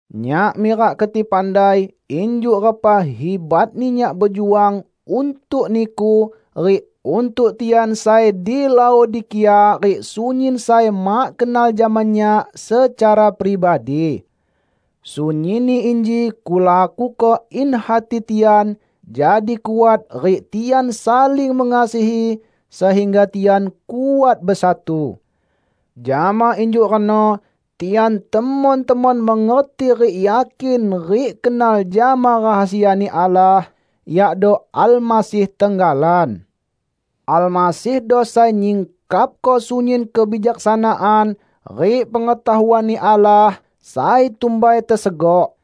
Nyak mirak keti pandai injuk repa hibatni nyak bejuang untuk niku rik untuk tian sai di Laodikia rik sunyin sai mak kenal jama nyak secara pribadi. Sunyinni inji kulakuko in hati tian jadi kuat rik tian saling mengasihi sehingga tian kuat besatu. Jama injuk reno tian temon-temon mengerti rik yakin rik kenal jama rahasia-Ni Allah, yakdo Almasih tenggalan. Almasihdo sai nyingkapko sunyin kebijaksanaan rik pengetahuan-Ni Allah sai tumbai tesegok.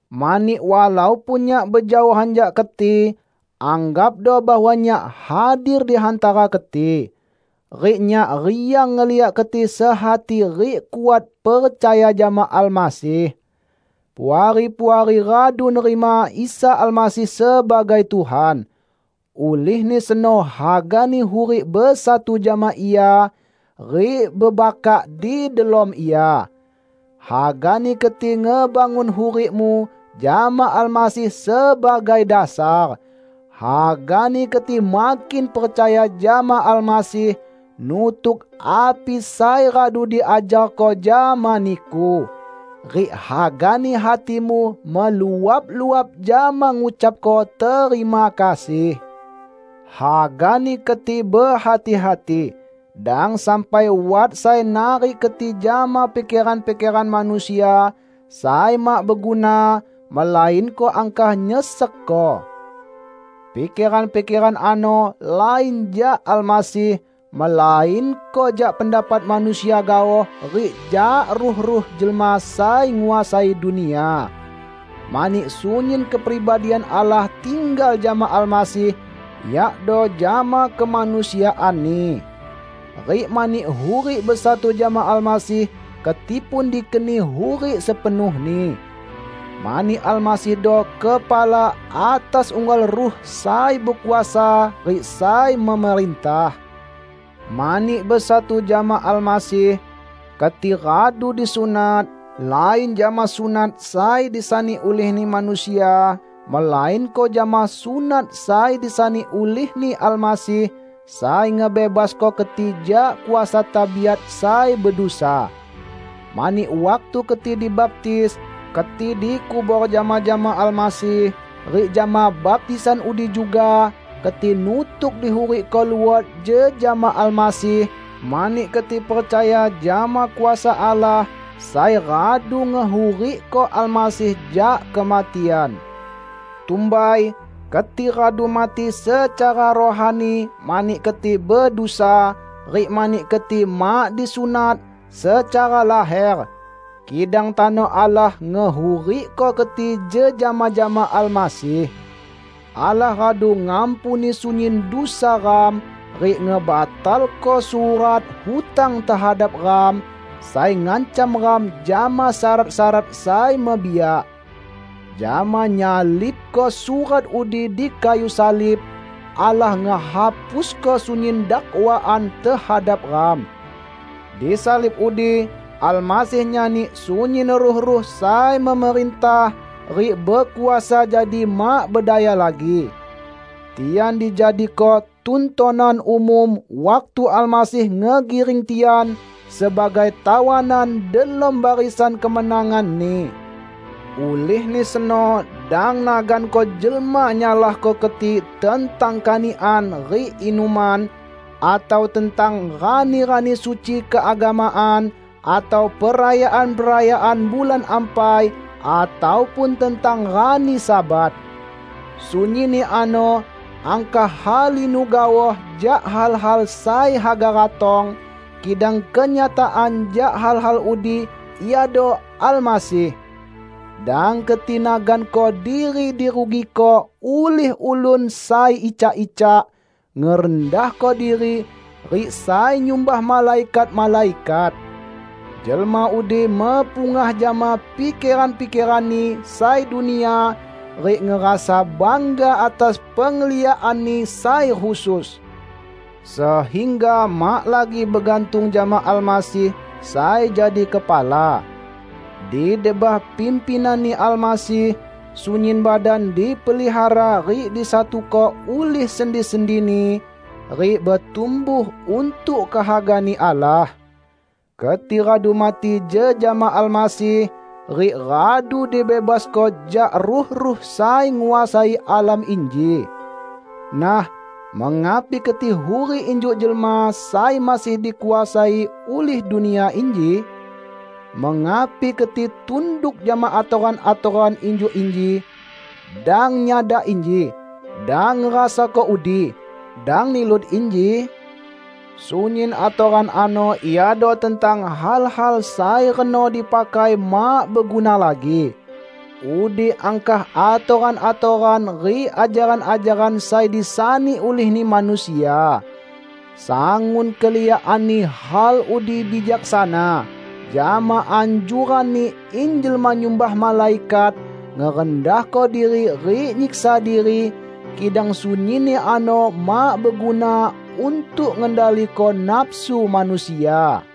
Mani walaupun nyak bejaohan jak keti, anggapdo bahwa nyak hadir di hantara keti. Rik nyak riang ngeliak keti sehati rik kuat percaya jama Almasih. Puari-puari radu nerima Isa Almasih sebagai Tuhan. Ulihni seno hagani hurik besatu jama Ia rik bebakak di delom Ia. Hagani keti ngebangun hurikmu jama Almasih sebagai dasar. Hagani keti makin percaya jama Almasih, nutuk api sai radu diajarko jama niku. Rik hagani hatimu meluap-luap jama ngucapko terima kasih. Hagani keti behati-hati, dang sampai wat sai narik keti jama pikeran-pikeran manusia sai mak beguna, melainko angkah nyesekko. Pikeran-pikeran ano lain jak Almasih, melainko jak pendapat manusia gaoh rik jak ruh-ruh jelma sai nguasai dunia. Mani sunyin kepribadian Allah tinggal jama Almasih, yakdo jama kemanusiaan-Ni. Rik mani hurik besatu jama Almasih, keti pun dikeni hurik sepenuhni. Mani Almasihdo kepala atas unggal ruh sai bekuasa rik sai memerintah. Mani besatu jama Almasih, keti radu disunat, lain jama sunat sai disani ulihni manusia, melainko jama sunat sai disani ulih-Ni Almasih, sai ngebebasko keti jak kuasa tabiat sai bedusa. Mani waktu keti dibaptis, keti dikubor jama-jama Almasih; rik jama baptisan udi juga, keti nutuk dihurikko luot jejama Almasih mani keti percaya jama kuasa Allah sai radu ngehurikko Almasih jak kematian. Tumbai, keti radu mati secara rohani mani keti bedusa, rik mani keti mak disunat secara laher. Kidang tano Allah ngehurikko keti jejama jama Almasih. Allah radu ngampuni sunyin dusa ram, rik ngebatalko surat hutang tehadap ram, sai ngancam ram jama syarat-syarat sai mebiak. Jama nyalibko surat udi di kayu salib, Allah ngehapusko sunyin dakwaan tehadap ram. Di salib udi Almasih nyani sunyin ruh-ruh sai memerintah rik bekuasa jadi mak bedaya lagi. Tian dijadiko tuntonan umum waktu Almasih ngegiring tian sebagai tawanan delom barisan kemenangan-Ni. Ulihni seno dang naganko jelma nyalahko keti tentang kanikan rik inuman, atau tentang rani-rani suci keagamaan, atau perayaan-perayaan bulan ampai, ataupun tentang rani Sabat. Sunyinni ano angkah halinu gaoh jak hal-hal sai haga ratong, kidang kenyataan jak hal-hal udi iado Almasih! Dang keti naganko diri dirugiko ulih ulun sai icak-icak ngerendahko diri rik sai nyumbah malaikat-malaikat. Jelma udi mepungah jama pikeran-pikeranni sai dunia rik ngerasa bangga atas pengliakanni sai khusus, sehingga mak lagi begantung jama Almasih sai jadi kepala. Di debah pimpinan-Ni Almasih, sunyin badan dipelihara rik disatuko ulih sendi-sendini, rik betumbuh untuk kehaga-Ni Allah. Keti radu mati jejama Almasih, rik radu dibebasko jak ruh-ruh sai nguasai alam inji. Nah, mengapi keti hurik injuk jelma sai masih dikuasai ulih dunia inji? Mengapi keti tunduk jama atoran-atoran injuk inji, "Dang nyadak inji", "Dang ngerasako udi", "Dang nilut inji"? Sunyin atoran ano iado tentang hal-hal sai reno dipakai mak beguna lagi. Udi angkah atoran-atoran rik ajaran-ajaran sai disani ulihni manusia. Sangun keliakanni hal udi bijaksana, jama anjuranni in jelma nyumbah malaikat, ngerendahko diri rik nyiksa diri; kidang sunyinni ano mak beguna untuk ngendaliko nafsu manusia.